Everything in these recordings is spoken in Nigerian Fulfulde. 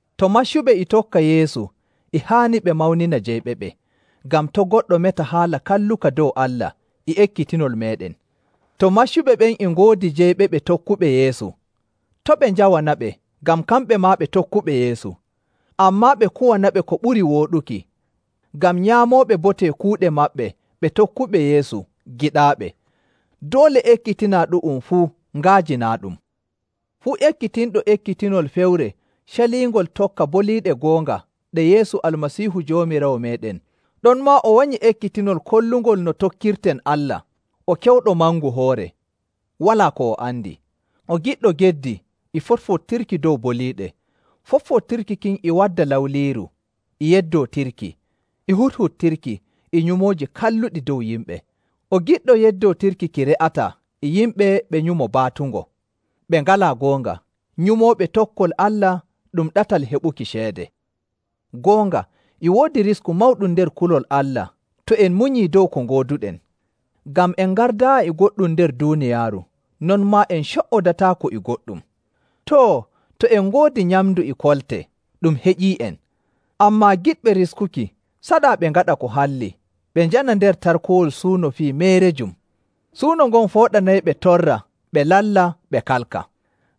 To maccuɓe e tokka Yeesu, e haani ɓe mawnina jeyɓeɓe, ngam to' goɗɗo meta haala kalluka dow Allah e ekkitinol meeɗen. To maccuɓe ɓen e ngoodi jeyɓeɓe tokkuɓe Yeesu, to' ɓe njawanaɓe ngam kamɓe maa ɓe tokkuɓe Yeesu. Ammaa ɓe kuwanaɓe ko ɓuri wooɗuki, ngam nyaamooɓe bote kuuɗe maɓɓe ɓe tokkuɓe Yeesu, giɗaaɓe. Doole ekkitinaa ɗu'um fuu nga'ajinaaɗum. Fuu ekkitinɗo ekkitinol feere caliingol tokka boliiɗe goonga ɗe Yeesu Almasiihu Joomiraawo meeɗen, ɗonmaa o wanyi ekkitinol kollungol no tokkirten Allah, o kewɗo mangu hoore, walaa ko o andi. O giɗɗo geddi e foɗfoɗtirki dow boliiɗe. Foɗfoɗtirki kin e wadda lawliiru, e yeddootirki, e huɗhuɗtirki, e nyumooji kalluɗi dow yimɓe. O giɗɗo yeddootirki ki re'ataa e yimɓe ɓe nyumo baatungo, ɓe ngalaa goonga, nyumooɓe tokkol Allah ɗum ɗatal heɓuki ceede. Goonga, e woodi risku mawɗum nder kulol Allah to en munyii dow ko ngooduɗen. Ngam en ngardaayi e goɗɗum nder duuniyaaru, non maa en co''odataako e goɗɗum. Too, to en ngoodi nyamndu e kolte, ɗum heƴii'en. Ammaa giɗɓe riskuki, saɗaa ɓe ngaɗa ko halli, ɓe njana nder tarkowol suuno fuu fii meerejum. Suuno ngon fooɗanayɓe torra ɓe lalla ɓe kalka.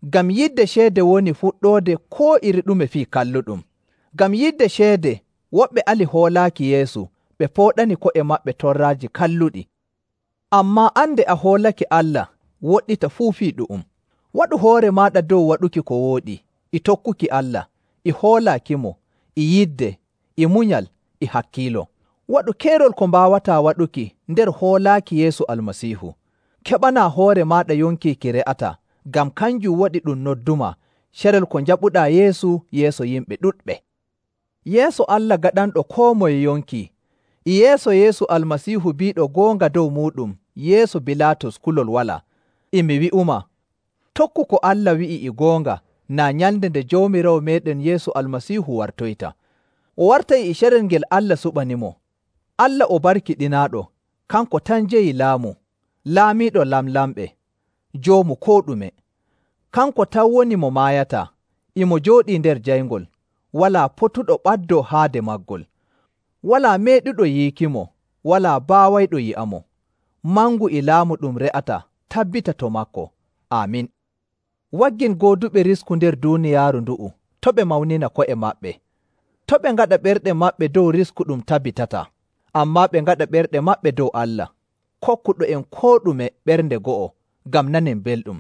Ngam yidde ceede woni fuɗɗoode koo iri ɗume fii kalluɗum. Ngam yidde ceede, woɓɓe alii hoolaaki Yeesu ɓe pooɗani ko'e maɓɓe torraaji kalluɗi. Ammaa an, nde a hoolake Allah, woɗɗita fuu fii ɗu'um. Waɗu hoore maaɗa dow waɗuki ko wooɗi, e tokkuki Allah, e hoolaakimo, e yidde, e munyal, e hakkiilo. Waɗu keerol ko mbaawataa waɗuki nder hoolaaki Yeesu Almasiihu. Keɓanaa hoore maaɗa yonki ki re'ataa, ngam kanjum waɗi ɗum noddumaa carel ko njaɓuɗaa Yeesu yeeso yimɓe ɗuɗɓe. Yeeso Allah gaɗanɗo koo ɗume yonki, e yeeso Yeesu Almasiihu biiɗo goonga dow muuɗum yeeso Bilaatus kulol walaa, e mi wi'umaa, tokku ko Allah wi'i e goonga naa nyalnde nde Joomiraawo meeɗen Yeesu Almasiihu wartoyta. O wartay e carel ngel Allah suɓanimo. Allah o barkiɗinaaɗo, kanko tan jeyi laamu, Laamiiɗo lamlamɓe, Joomu koo ɗume. Kanko tan woni mo maayataa, e mo jooɗii nder jayngol, walaa potuɗo ɓaddoo haade maagol, walaa meeɗuɗo yiikimo, walaa baawayɗo yi'amo. Mangu e laamu ɗum re'ataa tabbita to maako. Aamin. Waggin gooduɓe risku nder duuniyaaru ndu'u, to' ɓe mawnina ko'e maɓɓe, to' ɓe ngaɗa ɓerɗe maɓɓe dow risku ɗum tabbitataa, ammaa ɓe ngaɗa ɓerɗe maɓɓe dow Allah, kokkuɗo'en koo ɗume ɓernde go'o ngam nanen belɗum.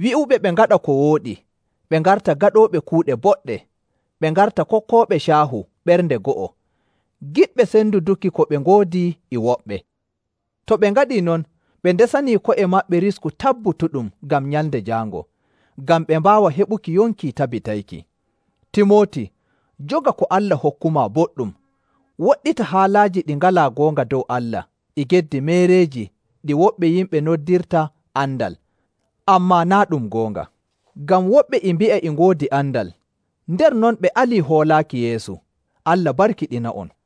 Wi'uɓe ɓe ngaɗa ko wooɗi, ɓe ngarta gaɗooɓe kuuɗe boɗɗe, ɓe ngarta kokkooɓe caahu ɓernde go'o, giɗɓe senduduki ko ɓe ngoodi e woɓɓe. To ɓe ngaɗii non, ɓe ndesanii ko'e maɓɓe risku tabbutuɗum ngam Nyalnde Jaango, ngam ɓe mbaawa heɓuki yonki tabbitayki. Timooti, joga ko Allah hokkumaa boɗɗum. Woɗɗita haalaaji ɗi ngalaa goonga dow Allah e geddi meereeji ɗi woɓɓe yimɓe noddirta “andal,” ammaa naa' ɗum goonga. Ngam woɓɓe e mbi'a e ngoodi andal, nder non ɓe alii hoolaaki Yeesu. Allah barkiɗina'on.